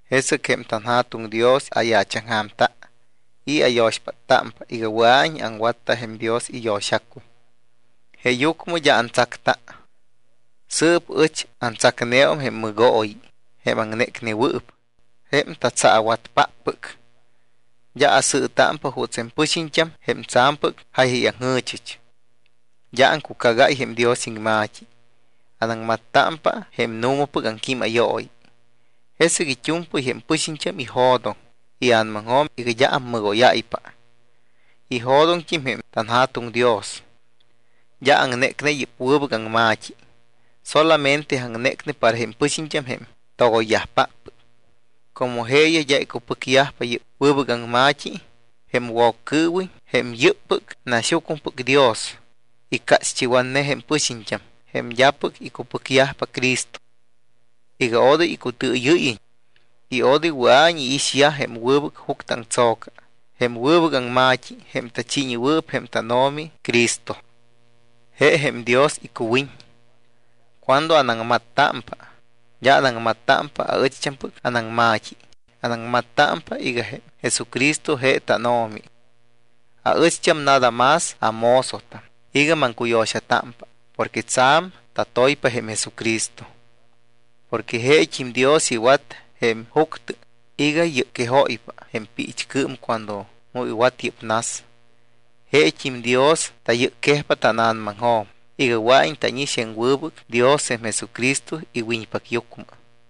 Jesɨc jém tanJa̱tuŋ Dios ayaachaŋja̱mta y ayo̱xpáttámpa iga wɨa̱iñ aŋwatta jém Dios iyo̱xacuy, jeeyucmɨ d́a antsacta. Sɨɨp ɨch antsacneum jém mɨgooyi, jém aŋnécnewɨɨp, jém tatsaawatpáppɨc. D́a asɨɨtámpa juuts jém pɨxiñt́am jém tsa̱mpɨc jáyayaŋjɨ̱chɨch. D́a aŋcucagáy jém Dios iŋma̱t́i. Anaŋmattámpa jém nu̱mapɨc aŋquímayooyi. Jesɨc it́u̱mpɨy jém pɨxiñt́am ijo̱doŋ ia̱namaŋjo̱m iga d́a ammɨgóyáypa. Ijo̱doŋt́im jém tanJa̱tuŋ Dios. D́a aŋnécne yɨ́p wɨbɨc aŋma̱t́i. Solamente aŋnécne para jém pɨxiñt́am jém togoyyajpáppɨc. Como jeeyaj d́a icupɨcyajpa yɨ́p wɨbɨc aŋma̱t́i, jém Woccɨɨwiñ, jém yɨ́ppɨc naxyucmɨpɨc dios, icácht́iwatne jém pɨxiñt́am, jém d́apɨc icupɨcyajpa Cristo, iga odoy icutɨɨyɨ́yiñ y odoy wɨa̱iñ iixyaj jém wɨbɨc juctɨ aŋtso̱ca, jém wɨbɨc aŋma̱t́i, jém tachiiñewɨɨp jém tánO̱mi Cristo; je jém Dios icuwiñ. Cuando anaŋmattámpa, d́a anaŋmattámpa aɨcht́ampɨc anaŋma̱t́i. Anaŋmattámpa iga jém Jesucristo je tánO̱mi. Aɨcht́am nada más amozotam iga maŋcuyo̱xatámpa porque tsa̱m tatoypa jém Jesucristo. Porque jeet́im Dios iwat jém juctɨ iga yɨcquejóypa jém piichcɨɨm cuando mu iwat yɨ́p nas. Jeet́im Dios tayɨcquejpa tána̱namaŋjo̱m iga wɨa̱iñ tánix jém wɨbɨc Dios jém Jesucristo iwiñpacyucmɨ.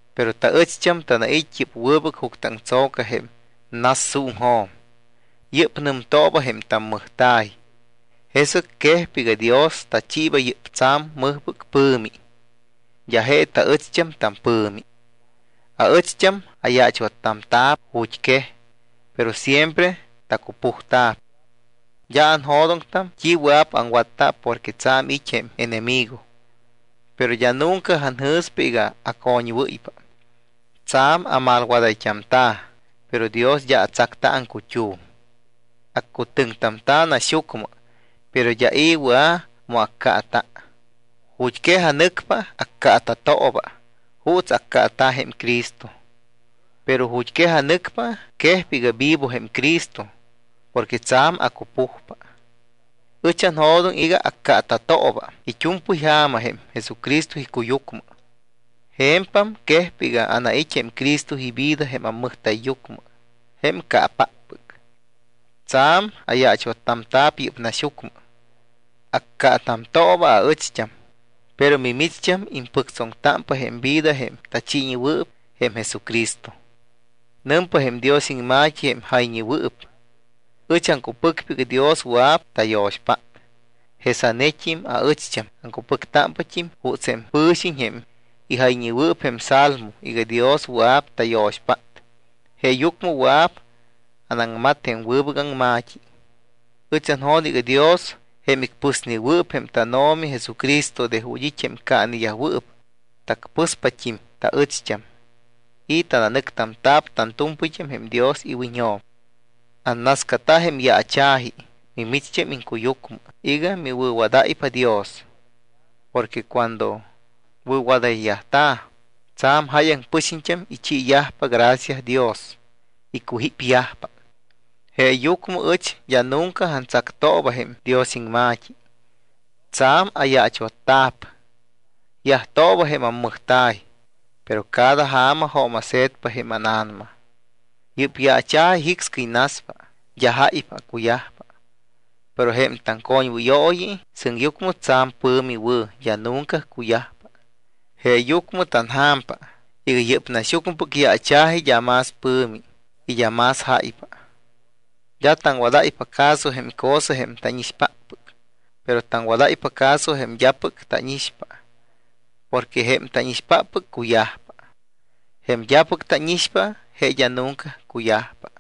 Pero taɨcht́am tanait́ yɨ́p wɨbɨc juctɨ aŋtso̱ca jém nassuuŋjo̱m. Yɨ́p nɨmtooba jém tammɨjta̱y. Jesɨc quejpa iga Dios tachiiba yɨ́p tsa̱m mɨjpɨc pɨ̱mi, d́a je taɨcht́am tampɨ̱mi. Aɨcht́am ayaachwattamta̱p ju̱t́quej, pero siempre tacupujta̱p. D́a anjo̱doŋtam t́i wɨa̱p aŋwatta porque tsa̱m it́ jém enemigo. Pero d́a nunca anjɨ̱spa iga acoñwɨ́ypa. Tsa̱m amalwadayt́amta̱, pero Dios d́a atsacta aŋcut́um. Accutɨŋtamta̱ naxyucmɨ, pero d́a i̱ wɨa̱p mu accaata̱. Ju̱t́quej anɨcpa, accaata̱tooba juuts accaata̱ jém Cristo. Pero ju̱t́quej anɨcpa, quejpa iga vivo jém Cristo porque tsa̱m acupujpa. Ɨch anjo̱doŋ iga accaata̱tooba it́u̱mpɨy ja̱ma jém Jesucristo icuyucmɨ. Je̱mpam quejpa iga anait́t́a jém Cristo ivida jém ammɨjta̱yyucmɨ, jém caapáppɨc. Tsa̱m ayaachwattamta̱p yɨ́p naxyucmɨ. Accaatamtooba aɨcht́am, pero mimicht́am impɨctsoŋtámpa jém vida jém tachiinewɨɨp jém Jesucristo. Nɨmpa jém Dios iŋma̱t́i jém jayñewɨɨp: “Ɨch aŋcupɨcpa iga Dios wɨa̱p tayo̱xpát.” Jesanet́im aɨcht́am aŋcupɨcpat́im juuts jém pɨ̱xiñ jém ijayñewɨɨp jém Salmo iga Dios wɨa̱p tayo̱xpát, jeeyucmɨ wɨa̱p anaŋmat jém wɨbɨc aŋma̱t́i. Ɨch anjo̱doŋ iga Dios, jém icpɨsnewɨɨp jém tánO̱mi Jesucristo de ju̱t́ it́ jém caaneyajwɨɨp, tacpɨspat́im taɨcht́am y tananɨctamta̱p tantu̱mpɨyt́am jém Dios iwiñjo̱m. Annascata jém yaacha̱ji mimicht́am iŋcuyucmɨ iga miwɨ̱wadáypa Dios. Porque cuando wɨ̱wadayyajta̱, tsa̱m jáyaŋ pɨxiñt́am ichiiyajpa gracia Dios, icujípyajpa. Jeeyucmɨ ɨch d́a nunca antsactamtooba jém Dios iŋma̱t́i. Tsa̱m ayaachwatta̱p. Yajtooba jém ammɨjta̱y, pero cada ja̱ma jooma̱se̱tpa jém ána̱nama. Yɨ́p yaacha̱ji jicscɨy naspa, d́a jáypa cuyajpa, pero jém taŋcoñwɨyooyi sɨŋyucmɨ tsa̱m pɨ̱mi wɨ̱, d́a nunca cuyajpa. Jeeyucmɨ tanja̱mpa iga yɨ́p naxyucmɨpɨc yaacha̱ji d́a más pɨ̱mi y d́a más jáypa. D́a taŋwadáypa caso jém cosa jém tánixpáppɨc, pero taŋwadáypa caso jém d́apɨc tánixpa porque jém tánixpáppɨc cuyajpa. Jém d́apɨc tánixpa, je d́a nunca cuyajpa.